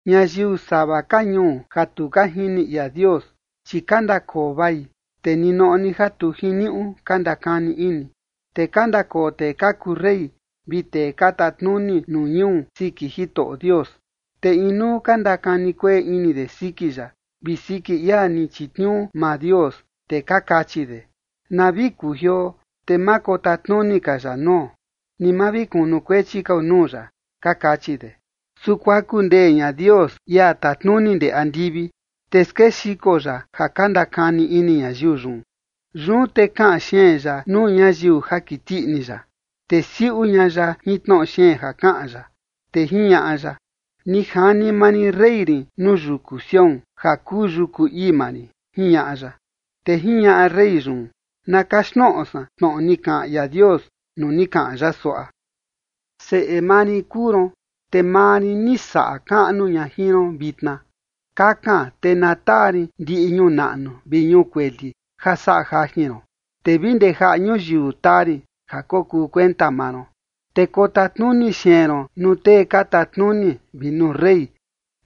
Ñayiu sava ka ñuu ja tu ka jini ia Dios, chi ka ndakoo vai, te ninoꞌo ni ja tu jiniuꞌu ka ndakani ini. Te ka ndakoo tee ka kuu rey vi tee ka tatnuni nuu ñuu siki Jitoꞌo Dios, te inuu ka ndakani kueꞌe ini de siki ya vi siki ia ni chitniuu maa Dios, te ka kachi de: “Na vi kujioo, te ma kotatnuni ka ya nuo, ni ma vi kunukuechi kao nuu ya”, ka kachi de. Su kuaku ndee ña Dios, ia tatnuni ndee andivi, te skexiko ya ja ka ndakani ini ñayiu yun. Yun te kaꞌan xeen ya nuu ñayiu ja kiti ini ya, te siuꞌu ña ya jin tnoꞌo xeen ja kaꞌan ya, te jiñaꞌa ya: “Ni jani maa rin rey rin nuu yuku Sión, ja kuu yuku ii maa rin”, jiñaꞌa ya. Te jiñaꞌa rey yun: “Na kaxtnoꞌo san tnoꞌo ni kaꞌan ia Dios nuu ni kaꞌan ya suaꞌa: Seꞌe maa rin kuu ron, te maa rin ni saꞌa kaꞌnu ña jin ron vitna. Kakan, te na taa rin ndiꞌi ñuu naꞌnu vi ñuu kueli ja saꞌa jajin ron, te vi ndee jaꞌa ñuyiu taa rin ja kokuu kuenta maa ron. Te kotatnuni xeen ron nuu tee ka tatnuni vi nuu rey,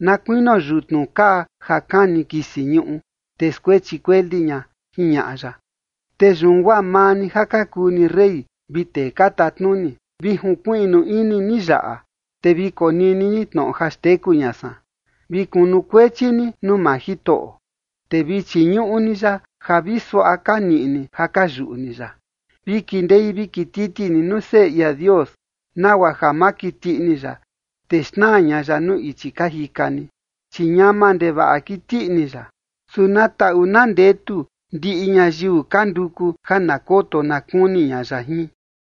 na kuinio yutnu kaa ja kani kisi ñuꞌu, te skuechi kueli ña”, jiñaꞌa ya. Te yun guaa maa ni ja ka kuu ni rey, vi tee ka tatnuni, vi junkuiꞌnu ini ni yaꞌa, te vi konini ni tnoꞌo ja xteku ña san. Vi kunukuechi ni nuu maa Jitoꞌo, te vi chiñuꞌu ni ya ja vi suaꞌa ka niꞌi ni ja ka yuꞌu ni ya. Vi kindei vi kititi ni nuu Seꞌe ia Dios, nagua ja ma kiti ini ya, te xnaa ña ya nuu ichi ka jika ni, chi ñama ndevaꞌa kiti ini ya. Su na taꞌu na ndetu ndiꞌi ñayiu ka nduku ja na koto na kuni ña ya jin.